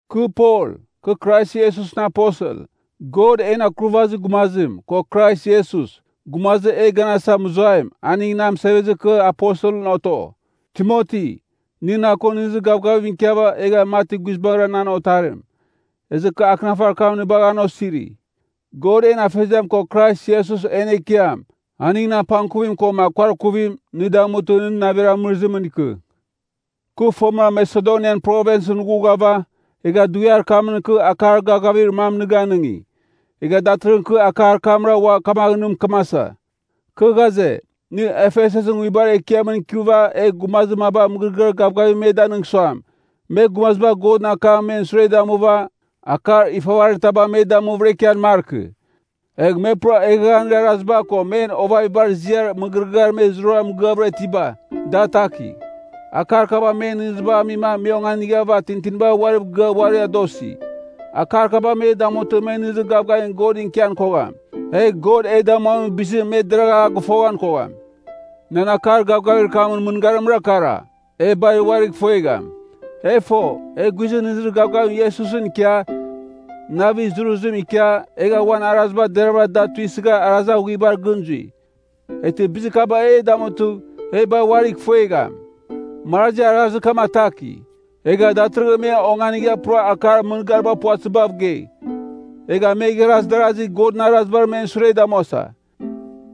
Kɨ Pol, kɨ Krais Iesusɨn aposel. God, en Akurvazir Gumazim, ko Krais Iesus, gumazir e ganasa mɨzuaim, aning na mɨsevezɨma kɨ aposelɨn oto. Timoti, nɨ na ko nɨghnɨzir gavgavim ikiava, egha mati guizbangɨra nan otarim. Ezɨ kɨ akɨnafarir kam nɨ bagha an osiri. God en Afeziam ko Krais Iesus en Ekiam, aningɨn apangkuvim koma kuarkuvim, nɨ damutɨ nɨ navir amɨrɨzimɨn ikɨ. Kɨ fomɨra Masedonian Provinsɨn ghughava, egha dughiar kamɨn kɨ akar gavgavir mam nɨ ganɨngi, egha datɨrɨghɨn kɨ akar kamra ua kamaghɨn nɨ mɨkɨmasa. Kɨ ghaze, nɨ Efesusɨn Nguibar Ekiamɨn ikɨva egh gumazir maba mɨgɨrɨgɨar gavgavim me danɨng suam, me gumaziba Godɨn akamɨn men sure damuva, akar ifavarir taba me damuvɨra ikian markɨ. Egh me pura eghaghanir araziba ko men ovavibar ziar mɨgɨrɨgɨar me zurara mɨgɨavɨra itiba, da atakigh. Akar kaba men nɨghnɨzibagh amima me onganighava tintiniba uariv gɨa uari adosi. Akar kaba me damutɨ, me nɨghnɨzir gavgavim Godɨn ikian kogham, egh God e damuamin bizim me deragh a gɨfoghan kogham. Nan akar gavgavir kamɨn mɨngarimra kara, e bar uarigh ifuegham. E fo, e guizɨn nɨghnɨzir gavgavim Iesusɨn ikia, navir zuruzim ikia, egha uan araziba deravɨra da tuisɨgha arazir aghuibar gɨn zui. Eghtɨ bizir kaba e damutɨ, e bar uarigh ifuegham. Marazi arazir kam ataki, egha datɨrɨghɨn me onganigha pura akar mɨngariba puvatɨzibav gei. Egha me igharaz darazi Godɨn Arazibar men sure damuasa.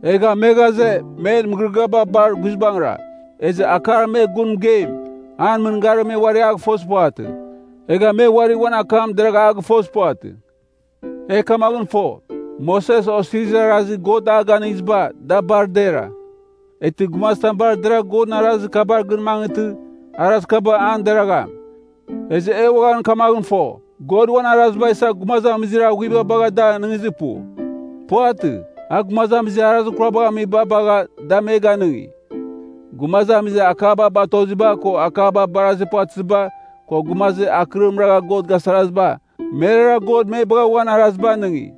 Egha me ghaze, men mɨgɨrɨgɨaba bar guizbangɨra. Ezɨ akar me gun mɨgeim, an mɨngarim me uari a gɨfozir puvatɨ, egha me uari uan akam deragha a gɨfozir puvatɨ. E kamaghɨn fo, Moses Osirizir Arazir God a Ganɨngiziba, da bar dera. Eghtɨ gumazitam bar deragh Godɨn Arazir kabar gɨn mangɨtɨ, Arazir Kaba an deragham. Ezɨ e uaghan kamaghɨn fo, God uan Araziba isa gumazamizir aghuiba bagha da anɨngizir pu. Puvatɨ, a gumazamizir arazir kurabagh amiba bagha, da me ganɨngi. Gumazamizir akaba batoziba, ko akaba barazir puvatɨziba, ko gumazir akɨrim ragha God gasaraziba, merara God me bagha uan Araziba anɨngi.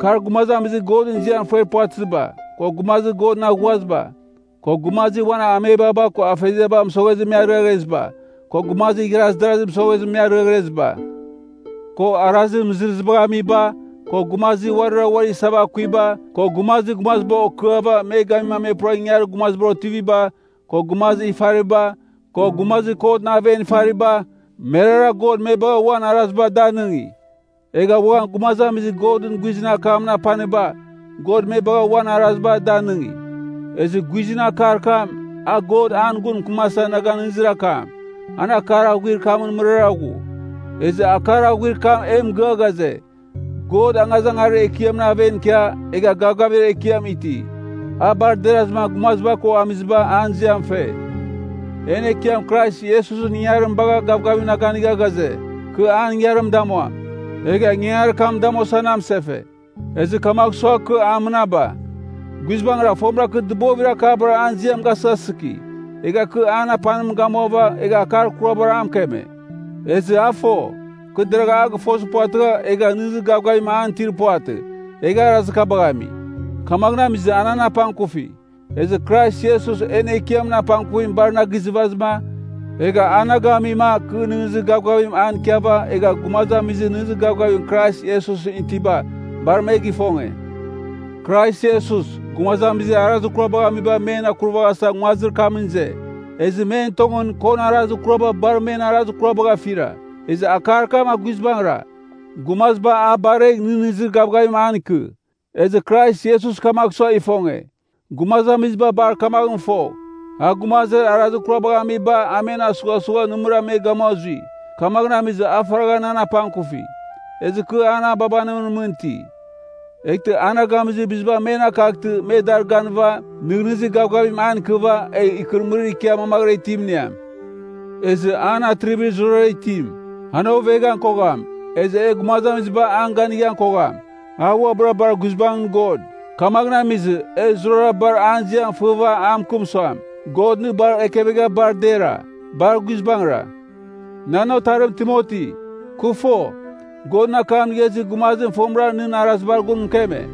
Kar gumazamizir Godɨn ziam fer puvatɨziba, ko gumazir Godɨn aghuaziba, ko gumazir uan amebaba ko afeziaba mɨsoghezɨ me aremeziba, ko gumazir igharaz darazi mɨsozima me ariaghreziba, ko arazir mɨzɨrɨzibagh amiba, ko gumazir uarira uari isava akuiba, ko gumazir gumaziba okɨava me gamima me pura ingangarir gumazibar otiviba, ko gumazir ifariba, ko gumazir kotɨn aven ifariba, merara God me bagha uan Araziba da anɨngi. Egha uaghan gumazamizir Godɨn guizɨn akamɨn apaniba, God me bagha uan Araziba da anɨngi. Ezɨ guizɨn akar kam, a God an gun mɨkɨmasa na ganɨngizir akam, an akar aghuir kamɨn mɨrara ghu. Ezɨ akar aghuir kam e mɨgɨa ghaze, God angazangarir ekiamɨn aven ikia, egha gavgavir ekiam iti. A bar derazɨma gumaziba ko amiziba an ziam fe. En Ekiam Krais Iesus ingangarim bagha gavgavim na ganigha ghaze, kɨ an ingangarim damuam. Egha ingangarir kam damuasa na amɨsefe. Ezɨ kamagh sua, kɨ a mɨnaba. Guizbangɨra, fomɨra kɨ dɨbovir akabar an ziam gasɨghasɨki, egha kɨ an apanim gamuava, egha akar kurabar a mɨkeme. Ezɨ a fo, kɨ deragha a gɨfozir puvatɨgha, egha nɨghnɨzir gavgavim an itir puvatɨ, egha arazir kabagh ami. Kamaghɨn amizɨma a nan apangkufi. Ezɨ Krais Iesus en Ekiamɨn apangkuvim bar na gizɨvazɨma, egha a na gamima, kɨ nɨghnɨzir gavgavim an ikiava egha gumazamizir nɨghnɨzir gavgavim Krais Iesusɨn itiba, bar me gɨfonge. Krais Iesus, gumazamizir arazir kurabagh amiba men akuraghasa nguazir kamɨn ize. Ezɨ men tongɨn, kon arazir kuraba bar men arazir kurabagh afira. Ezɨ akar kam a guizbangɨra, gumaziba a baregh nɨghnɨzir gavgavim an ikɨ. Ezɨ Krais Iesus kamagh sua ifonge, gumazamiziba bar kamaghɨn fogh, a gumazir arazir kurabagh amiba a men asughasugha nɨmɨra me gamua zui. Kamagh amizɨma a faragha nan apangkufi, ezɨ kɨ an ababanimɨn mɨn iti, eghtɨ a na gamizir biziba men akaghtɨ me dar ganɨva, nɨghnɨzir gavgavim an ikɨva, egh ikɨrɨmɨrim ikia mamaghɨra itim iniam. Ezɨ an Atrivir Zurara Itim. An oveghan kogham, ezɨ e gumazamiziba an ganighan kogham. A uabɨra bar guizbangɨn God. Kamaghɨn amizɨ, e zurara bar an ziam fɨva a mɨkɨm suam, God nɨ bar ekevegha bar dera. Bar guizbangɨra. Nan otarim Timoti, kɨ fo, Godɨn akam inigha izir gumazim fomɨra nɨn arazibar gun mɨkeme.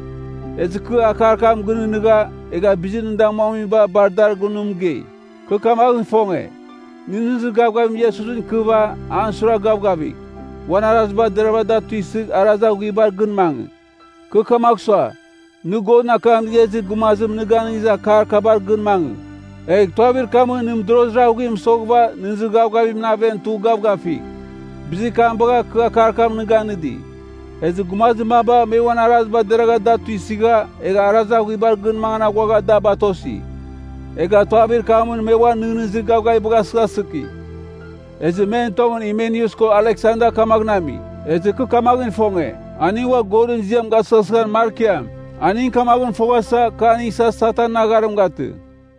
Ezɨ kɨ akar kam gɨnɨghnɨgha, egha bizir nɨ damuamiba bar dar gun nɨ mɨgei. Kɨ kamaghɨn ifonge, nɨ nɨghnɨzir gavgavim Iesusɨn ikɨva an suiragh gavgavigh, uan araziba deravɨra da tuisɨgh arazir aghuibar gɨn mangɨ. Kɨ kamagh sua, nɨ Godɨn akam inigha izir gumazim nɨ ganɨngizir akar kabar gɨn mangɨ, egh tuavir kamɨn nɨ mɨdorozir aghuim mɨsoghɨva nɨghnɨzir gavgavimɨn aven tugh gavgafigh. Bizir kam bagha, kɨ akar kam nɨ ganɨdi. Ezɨ gumazir maba, me uan araziba deragha da tuisɨgha, egha arazir aghuibar gɨn mangan aghuagha da batosi. Egha tuavir kamɨn me uan nɨghnɨzir gavgavibagh asɨghasɨki. Ezɨ men tongɨn Himeneus ko Aleksanda kamaghɨn ami. Ezɨ kɨ kamaghɨn ifonge, aning ua Godɨn ziam gasɨghasɨghan markiam. Aning kamaghɨn foghasa, kɨ aning isa Satanɨn agharim gatɨ.